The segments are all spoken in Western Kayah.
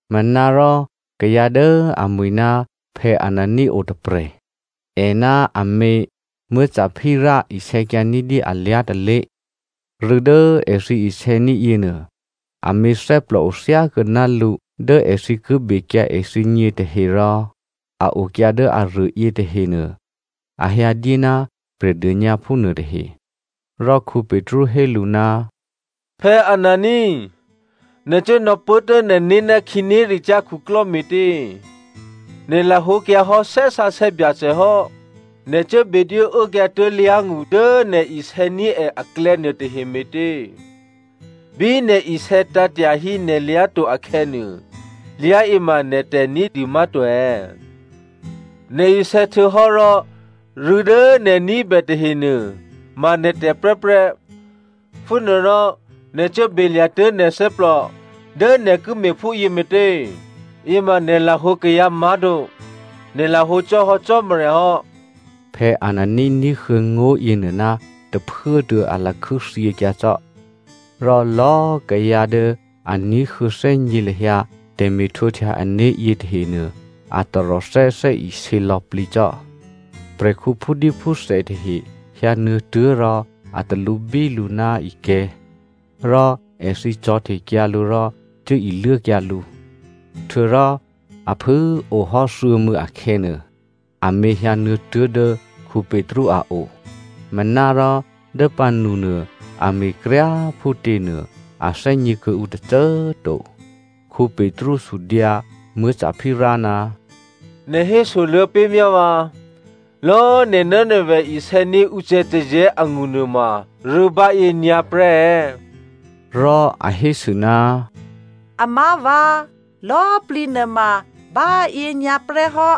Manárò kayǎ dố amwi̤ ná Anania otôprè̤. È ná amě Sapphira isè̌kyǎ ní̤dyé alyá̤ tôlé̤. Rû̌ dố èthǐ isè̌ní̤ yěnuô, amě thè́plòo thyákuô̌ ná lǔ dố èthǐ ki bekyǎ èthǐgně tahe rò a okyǎ dố aruô yětahenuô a hyǎdyé ná Prè̤dônyǎphú nuôtahe. Rò Petru hé lǔ, “Anania꤮ nè̤ cuố nò̌pốtuố̤ nè̤né̤ ná khǐnéricyá̤ khuklò́ me̤tě? Nè̤ lahǒkyǎhò́ Thè́ Sǎsè̌ Byacè hò́. Nè̤ cuố bedwó uốkyǎ tuố̤lyá̤ ngṳ dố nè̤ isè̌ní̤ è aklè̌ nuôtahe me̤tě? Bí nè̤ isè̌tǎ̤ tyahí nè̤lyá̤ to akhè̌nuô, lyá̤yě ma nè̤tè̤ ní̤dû má̤to è̌? Nè̤ isè̌htuô̌hò́ rò rû̌ dố nè̤ ní̤bè tahenuô꤮ ma nè̤tè̤ prè́prè́. Phúnuô rò nè̤ cuố belya̤tuố̤ nè̤ thè́plò dố nè̤ ki me̤phúyě me̤tě? Yěma nè̤ lahǒ kayǎ má̤to, nè̤ lahǒ cò́ hò́ Cò́marya hò́.” Anania ní̤huô̌ ngó̤ yěnuô ná tôphuốtuô̌ a lakhû́thyěkyǎ cò́. Rò lò̌꤮ kayǎ dố a ní̤huô̌thè́gně lahyǎ tè̤me̤htwǒhtya ané̤ yětahenuô a taròthè́ thè́isě lò̌plǐ cò́. Prè̤khǔ phúdíphúthè tahe hyǎnuô̌tuố̤ rò a talǔbí lǔ ná ikè̤̌, rò èthǐ cò̤̌htekyǎ lǔ rò cuố iluốkyǎ lǔ. Htuô̌rò a phû꤮ ohò́ thuô̌mû̌ akhè̌nuô, amě hyǎnuô̌ tuố̤dố Petru a o. Manárò dố pǎnunuô, a me̤kryá꤮ phútěnuô a thè́gně kuô̌ǔ tôcô꤮ to. Petru sudyǎ Sapphira, “Nè̤ hésoluô̌ pé̤ myá vǎ, lò̌꤮ nè̤ ná nè̤vè̤ isè̌ní̤ ucè̌tazè̌ angṳ nuôma rû̌ báyě nyǎprè́ è̌?” Rò a hésû, “Amá̤vǎ, lò̌꤮ plǐ nuôma báyě nyǎprè́ hò́.”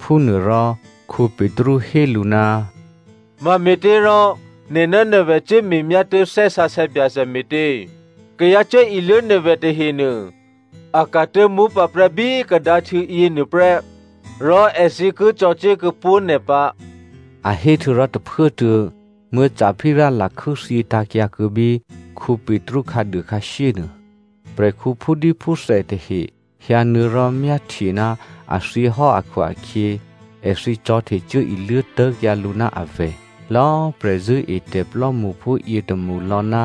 Phúnuôrò Petru hé lǔ, “Mame̤těrò nè̤ ná nè̤vè̤ cuố me̤myá tuố̤ Thè́ Sǎsè̌ Byacè me̤tě? Kayǎ cuốiluố nè̤vè̤ tahenuô, a ka̤tuố̤ mópǎprè́ bí kadǎhtû̌ yěnuô prè́ rò èthǐ ki cò̤̌cuố kuô̌ pó̤ nè̤ pǎ!” A hé htuô̌rò tôphuốtuô̌ Sapphira lakhû́ thyětǎ̤kyǎ kuô̌ bí Petru khǎduô khǎshyé nuô. Prè̤khǔ phúdíphúthè tahe hyǎnuô̌ rò myáhtye ná a thyěhò́ akhu-akhyě èthǐ cò̤̌htecuốiluố tố̤kyǎ lǔ ná avè̤. Lò̌꤮ prè̤zṳ̂́etè̤ plò́mṳphú yětômṳlò̌ ná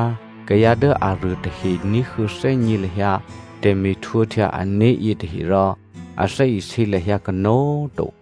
kayǎ dố aruô tahe ní̤huô̌thè́gně lahyǎ tè̤me̤htwǒhtya ané̤ yětaherò a thè́isě lahyǎ kanó̤꤮ to.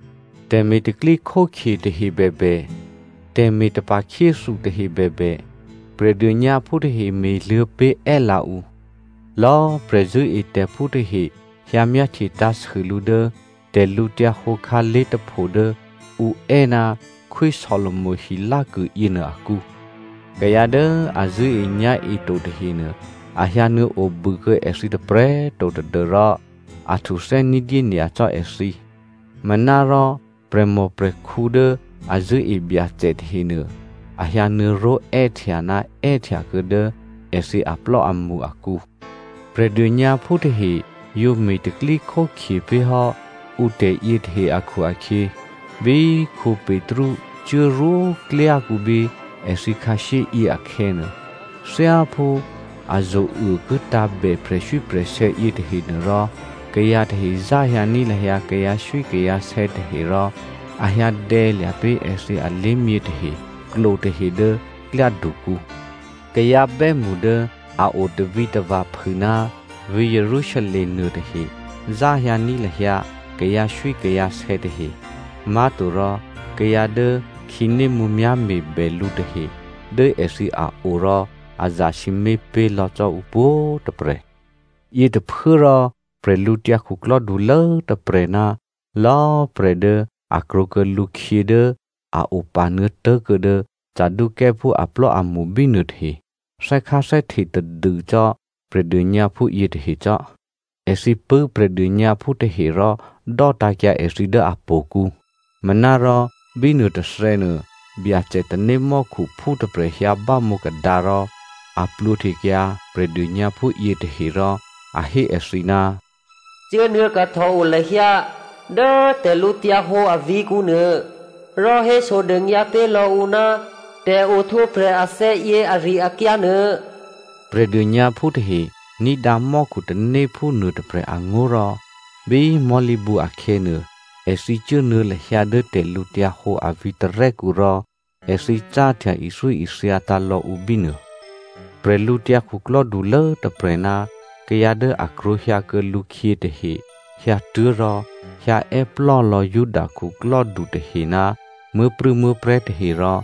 Tè̤me̤ tè̤pro̤tè̤prya̤ tahe bèbè, tè̤me̤ tapa̤khyéthu tahe bèbè, Prè̤dônyǎphú tahe me̤luô̌ pé̤ è́lǎ ǔ. Lò̌꤮ prè̤zṳ̂́etè̤phú tahe hyǎ myáhtye tǎ̤sû lǔ dố tè̤lǔhǒdu khǎlé̤ tôpho dố ǔ è́ ná Khwí Solomo hilákû yěnuô akǔ. Kayǎ dố a zṳ̂́enyá̤e to tahenuô a hyǎnuô̌ obû kuô̌ èthǐ tôprè̤꤮ to tadû́rò a htuthè́ ní̤dyé nyacò́ èthǐ. Manárò prè̤mòprè̤khǔ dố a zṳ̂́e Byacè tahenuô, a hyǎnuô̌ró̤ è́htya ná è́htya kuô̌ dố èthǐ aplò́amṳ akǔ. Prè̤dônyǎphú tahe yǒ me̤ tè̤pro̤tè̤prya̤ pé̤ hò́ ǔ tè̤yětahe akhu-akhyě, bí Petru cuốrwó klyákǔ bí èthǐ khǎshyé yě akhè̌nuô, thyáphú a zo̤uô ki tǎ̤bè prè̤swíprè̤sè̌ yětahe nuôrò, kayǎ tahe záhyǎní̤ lahyǎ kayǎswíkayǎsè̌ tahe rò a hyǎ dè̌lya̤ pé̤ èthǐ alé̤myě tahe, klo tahe dố klyádukǔ. Kayǎ bè́mṳ dố a o tavǐtava̤ phû ná vǐ̤ Jerusalem nuôtahe záhyǎní̤ lahyǎ kayǎswíkayǎsè̌ tahe, má̤torò kayǎ dố khǐnémǔmyá̤ me̤bè lǔ tahe dố èthǐ a o rò a zasǐmé̤ pé̤ lò̌ cò́ ǔ pwǒ̤꤮ tôprè̤. Yětôphuốrò bwídukhulố tôprè̤ ná lò̌꤮ prè̤ dố a krwǒkuô̌ lǔkhyě dố a opanuô̌ tố̤kuô̌ dố Saducěophú aplò́amṳ bínuô tahe, thè́kháthè́hte tadû cò́ Prè̤dônyǎphú yětahe cò́. Èthǐ pṳ̂́ Prè̤dônyǎphú tahe rò dò́tǎ̤kyǎ èthǐ dố htò̌kǔ. Manárò bí nuôtôthè̌nuô, Byacè tanémò́khuphú tôprè̤ hyǎbámǒ kadǎ rò a plwǒhtekyǎ Prè̤dônyǎphú yětahe rò a hé èthǐ, “Cuốnuô̌ kahtòo lahyǎ dố tè̤lǔhǒdu avǐ̤kǔ nuô rò hésodônyǎ pé̤ lò̌ǔ ná tè̤ohtwǒprè̤ athè̌ yě ari-akyǎ nuô.” Prè̤dônyǎphú tahe ní̤dǎ mò́khutanéphú nuôtôprè̤ angó̤ rò, bí mò̤́lǐbǔ akhè̌nuô, èthǐ cuốnuô̌ lahyǎ dố tè̤lǔhǒdu a vǐ̤tarè́kǔ rò èthǐ cáhtya ithyóithyatǎ̤ lò̌ ǔ bínuô. Bwídukhulố tôprè̤ ná kayǎ dố a krwǒhyǎkuô̌ lǔkhyě tahe hyǎtuố̤ rò hyǎ è́plò́ lò̌ Juda khuklò́du tahe ná muố̤prû̌muố̤prè̤́ tahe rò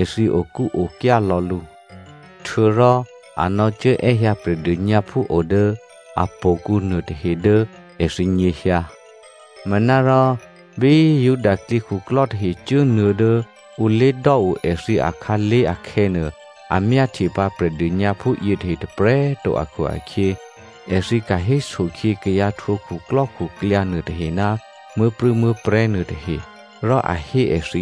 èthǐ okúokyá lò̌ lǔ. Htuô̌rò a nò̌cuốè́hyǎ Prè̤dônyǎphú o dố htò̌kǔ nuôtahe dố èthǐ nyěhyǎ. Manárò bí Juda klyěkhuklò́ tahe cuốnuô̌ dố ǔ lé̤dò́o èthǐ akhǎlé̤ akhè̌nuô, a myáhtye pǎ Prè̤dônyǎphú yětahe tôprè̤꤮ to akhu-akhyě, èthǐ ka̤héso khyě kayǎ htwǒ khuklò́khuklyǎ nuôtahe ná muố̤prû̌muố̤prè̤́ nuôtahe, rò a hé èthǐ,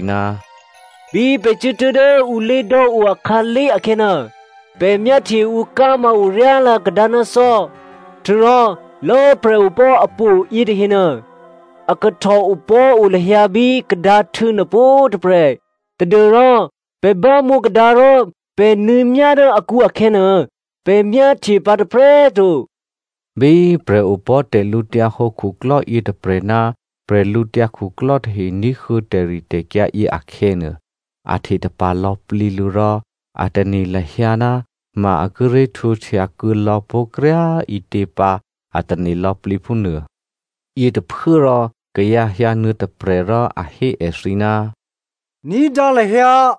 “Bí pè̤ cuốtuố̤ dố ǔ lé̤dò́o akhǎlé̤ akhè̌nuô, pè̤ myáhtye ǔ ká̤ma oryálǎ kadǎ ná thò́. Htuô̌rò lò̌꤮ prè̤opò̤́ htò̌ yětahenuô, a kahtòopò̤́o lahyǎ bí kadǎhtû̌ nuô pwǒ̤꤮ tôprè̤ tadû́rò pè̤ bámǒ kadǎ rò pè̤ nuô̌myá dố akǔ akhè̌nuô, pè̤ myáhtye pǎ tôprè̤꤮ to.” Bí prè̤opò̤́ tè̤lǔhǒdu khuklò́ yětôprè̤ ná prè̤lǔtyǎ khuklò́ tahe ní̤huô̌ tè̤ritè̤kyǎ yě akhè̌nuô, a htetapa̤ lò̌plǐ lǔ rò a tane̤ lahyǎ ná ma a kíré̤ htwǒhtya kuô̌lò̌ pó̤ kryá꤮ ǐtě pǎ a tane̤ lò̌plǐ phúnuô. Yětôphuốrò kayǎ hyǎnuô̌ tôprè̤ rò a hé èthǐ, “Ní̤dǎ lahyǎ꤮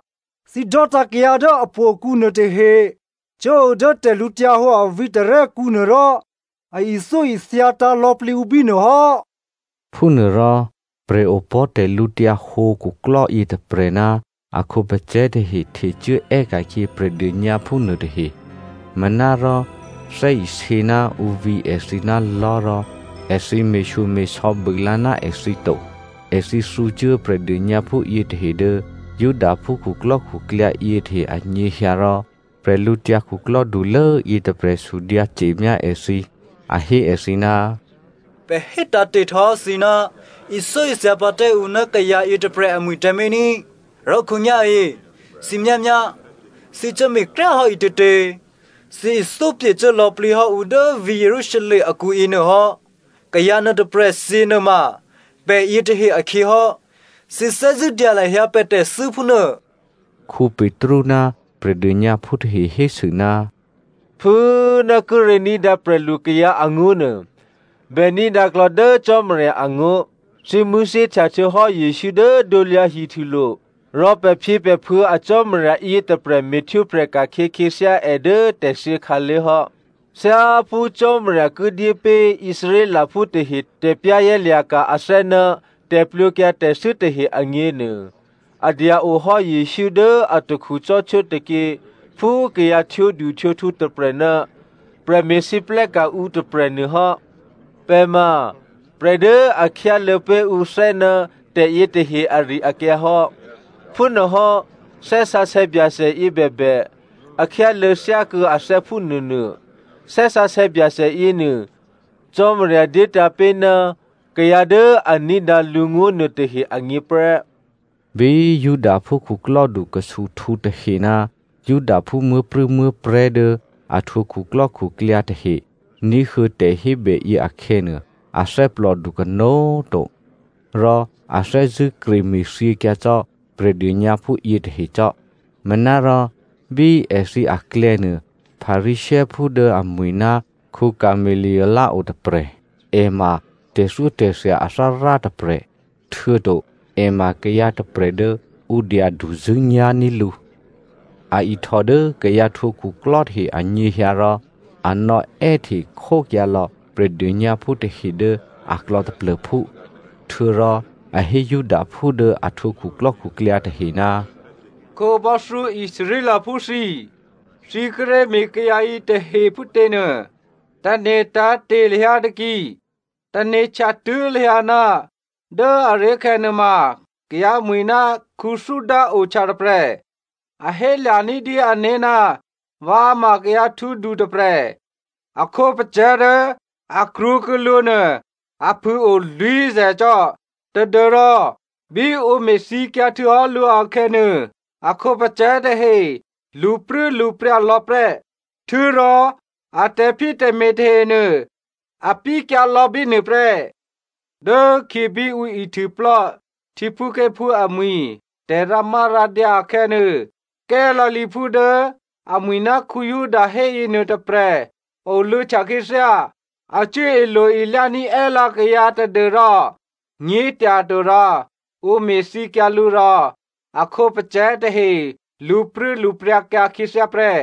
thǐ dò́tǎ̤ kayǎ dố htò̌kǔ nuôtahe cuốo dố tè̤lǔhǒdu a vǐ̤tarè́kǔ nuô rò a ithyóithyatǎ̤ lò̌plǐ ǔ bínuô hò́.” Phúnuôrò prè̤opò̤́ tè̤lǔhǒdu khuklò́ yětôprè̤ ná a khǒpacè̤̌ tahe htecuố è́ka̤khyě Prè̤dônyǎphú nuôtahe. Manárò thè́isě ná ǔ vǐ èthǐ ná lò̤́ rò èthǐ me̤shyome̤sò̌ bû lǎ ná èthǐ to. Èthǐ thǔcuố Prè̤dônyǎphú yětahe dố Judaphú khuklò́khuklyǎ yětahe anyěhyǎ rò bwídukhulố yětôprè̤ sudyǎ ce̤myá èthǐ. A hé èthǐ, “Pè̤ hétǎ̤héte̤ htuô̌hò́ thǐ ná ithyóithya pǎ tǎ ǔ ná kayǎ yětôprè̤ amwi̤ tǎmé̤ ní꤮, rò khǒnyá̤yě thǐ myámyá thǐ cuố me̤kryá꤮ hò́ ǐtětě! Thǐ ithyó pye̤cuố lò̌plǐ hò́ ǔ dố vǐ̤ Jerusalem akǔ yěnuô hò́. Kayǎ nuôtôprè̤ thyě nuôma pè̤ yětahe akhyě hò́, thǐ thè́zṳ̂́ dya lahyǎ pè̤ tè̤thû́ phúnuô.” Petru ná Prè̤dônyǎphú tahe hésû, “Phû꤮ ná kíré̤ ní̤dǎ prè̤lu kayǎ angó̤nuô, bè ní̤dǎ klò̌ dố Cò́marya angó̤. Thǐ mṳ̂̌thyěhtya htuô̌hò́ Jesǔ dố krusulo̤ rò pè̤phyěpè̤phuô̌ a Cò́marya yětôprè̤ me̤htwǒprè̤ ka̤khyě khyěthyá è dố tè̤thyě khǎlé̤ hò́. Thyáphú Cò́marya ki dyé pé̤ Israelphú tahe tè̤za̤ ní̤dû né̤ ná tè̤plwǒkyǎ tè̤thû́ tahe agněnuô, a dya-ohò́ Jesǔ dố atakhu cò́htwó tôkyě phú kayǎ htwǒduhtwǒkhu tôprè̤ ná prè̤me̤lwóhteka̤ ǔ tôprè̤nuô hò́. Pè̤ ma prè̤ dố a khyáluô̌ pé̤ ǔ thè́ ná tè̤yě tahe ari-akyǎ hò́. Phúnuôhò́ Thè́ Sǎsè̌ Byacè yě bèbè, a khyáluô̌ thyákuô̌ athè́ phúnuônuô. Thè́ Sǎsè̌ Byacè yěnuô Cò́marya dyétǎ̤ pé̤ ná kayǎ dố a ní̤dǎ lǔngó̤ nuôtahe agně prè́.” Bí Judaphú khuklò́du khusuhtǔ tahe ná Judaphú muố̤prû̌muố̤prè̤́ dố a htwǒ khuklò́khuklyǎ tahe ní̤huô̌ tè̤hébèyě akhè̌nuô, a thè́plòdu kanó̤꤮ to. Rò a thè́zṳ̂́ kreme̤thyěkyǎ cò́ Prè̤dônyǎphú yětahe cò́. Manárò bí èthǐ aklè̌nuô Pharisěophú dố amwi̤ ná Gamalie otôprè̤. È ma tè̤thyótè̤thya athárá tôprè̤, htuô̌to è ma kayǎ tôprè̤ dố ǔ dyaduzṳ̂́nyá̤ní̤ lǔ. A ihtò dố kayǎ htwǒ khuklò́ tahe anyěhyǎ rò a nò̌è́hte khókyǎ lò̌ Prè̤dônyǎphú tahe dố aklò̌ taplô̤phú. Htuô̌rò a hé Judaphú dố a htwǒ khuklò́khuklyǎ tahe, “Khǒbò́thyó Israelphú thǐ꤮, thǐ kíré̤ me̤ kayǎ yětahe phútěnuô, tane̤ tǎ̤te̤ lahyǎ taki. Tane̤htya tuố̤ lahyǎ ná dố aré̤khè̌ nuôma kayǎmwi̤ ná Theuda ohtya tôprè̤. A hélya̤ ní̤dyé ané̤ ná vǎ ma kayǎ htwǒdu tôprè̤. A khǒpacè̤̌ dố a krwǒkuô̌ lǔ nuô a phû꤮ o lwǐ̤zè̤ cò́, tadû́rò bí ǔ me̤thyěkyǎ htuô̌hò́ lǔ akhè̌nuô, a khǒpacè̤̌ tahe lṳpruốlṳpryǎ lò̌ prè́. Htuô̌rò a tè̤phyétè̤me̤ tahenuô a pyékyǎlò̌ bínuô prè́. Dốkhyě bí ǔ ihtuôplò́ htyěphúké̤phú amwi̤ tè̤rǎmárǎdyǎ akhè̌nuô, Galileaphú dố amwi̤ ná Juda héyěnuô tôprè̤ oluô̌htya khyěthyá. A cuố ilo-ilyání̤ è́lǎ kayǎ tadû́rò nyě̤tyatorò ǔ me̤thyěkyǎ lǔ rò a khǒpacè̤̌ tahe lṳpruốlṳpryǎkyǎ khyěthyá prè́.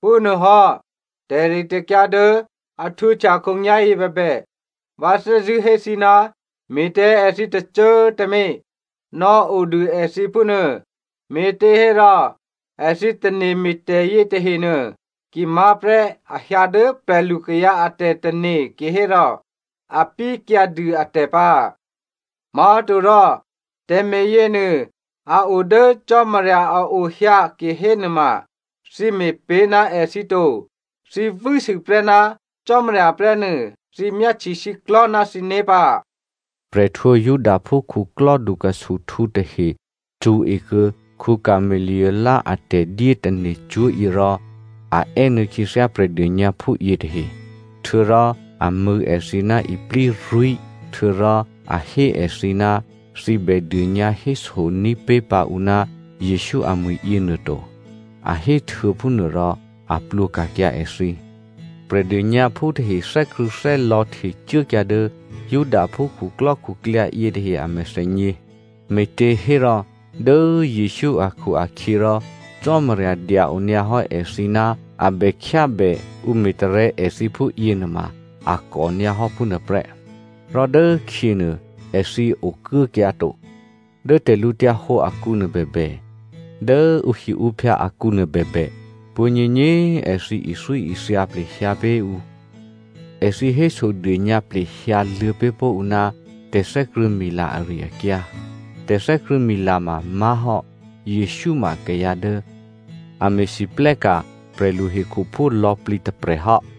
Phúnuôhò́ tè̤ritè̤kyǎ dố a htwǒhtya khǒnyá̤yě bèbè, vǎ thè́zṳ̂́ hé thǐ ná me̤ tǎ èthǐ tôcô꤮ tǎmé̤. Nò̌odû èthǐ phúnuô, me̤těhérò èthǐ tane̤ me̤tè̤ yětahenuô, ki má̤ prè́ a hyǎ dố prè̤lu kayǎ a tè̤tane̤ kihérò a pyékyǎ dû atè̤ pǎ꤮. Má̤torò tè̤me̤ yěnuô, a o dố Cò́marya a ohyǎ kihénuôma thǐ me̤pé̤ ná èthǐ to, thǐ vû́sû prè́ ná Cò́marya prè́ nuô, thǐ myáhtye shyěklò̤́ ná thǐné̤ pǎ.” Prè̤ htwǒ Judaphú khuklò́dukhusuhtǔ tahe cṳ̌e kuô̌ Gamalie a tè̤dyétane̤cwó̤ yě rò a è́nuô̌ khyěthyá Prè̤dônyǎphú yětahe. Htuô̌rò a mṳ̂̌ èthǐ ná iplírwí̤ htuô̌rò a hé èthǐ ná thǐ bè dônyǎhésoní̤ pé̤ pǎ ǔ ná Jesǔ amwi̤ yěnuô to, a héhtuô̌ phúnuôrò a plwǒ ka̤kyǎ èthǐ. Prè̤dônyǎphú tahe thè́krṳ̂̌thè́lò̌ htecuốkyǎ dố Judaphú khuklò́khuklyǎ yětahe a mèthènyě, me̤těhérò dố Jesǔ akhu-akhyěrò Cò́marya dya-o nyǎ hò́ èthǐ ná a bè khyábè ǔ me̤tarè̤̌ èthǐ phúyě nuôma a kò nyǎ hò́ phúnuô prè́. Rò dốkhyěnuô, èthǐ okuốkyǎ to. Dố tè̤lǔhǒdu akǔnuô bèbè, dố ǔhiǔphyǎ akǔnuô bèbè, pwǒ̤nyěnyě꤮ èthǐ ithyóithya plehyǎ pé̤ ǔ, èthǐ hésodônyǎ plehyǎ luô̌ pé̤ pó̤ ǔ ná tè̤thè́krṳ̂̌mila ari-akyǎ. Tè̤thè́krṳ̂̌mila ma má̤hò́ Jesǔ ma kayǎ dố a me̤lwóhteka̤ prè̤lu hekhuphú lò̌plǐ tôprè̤ hò́.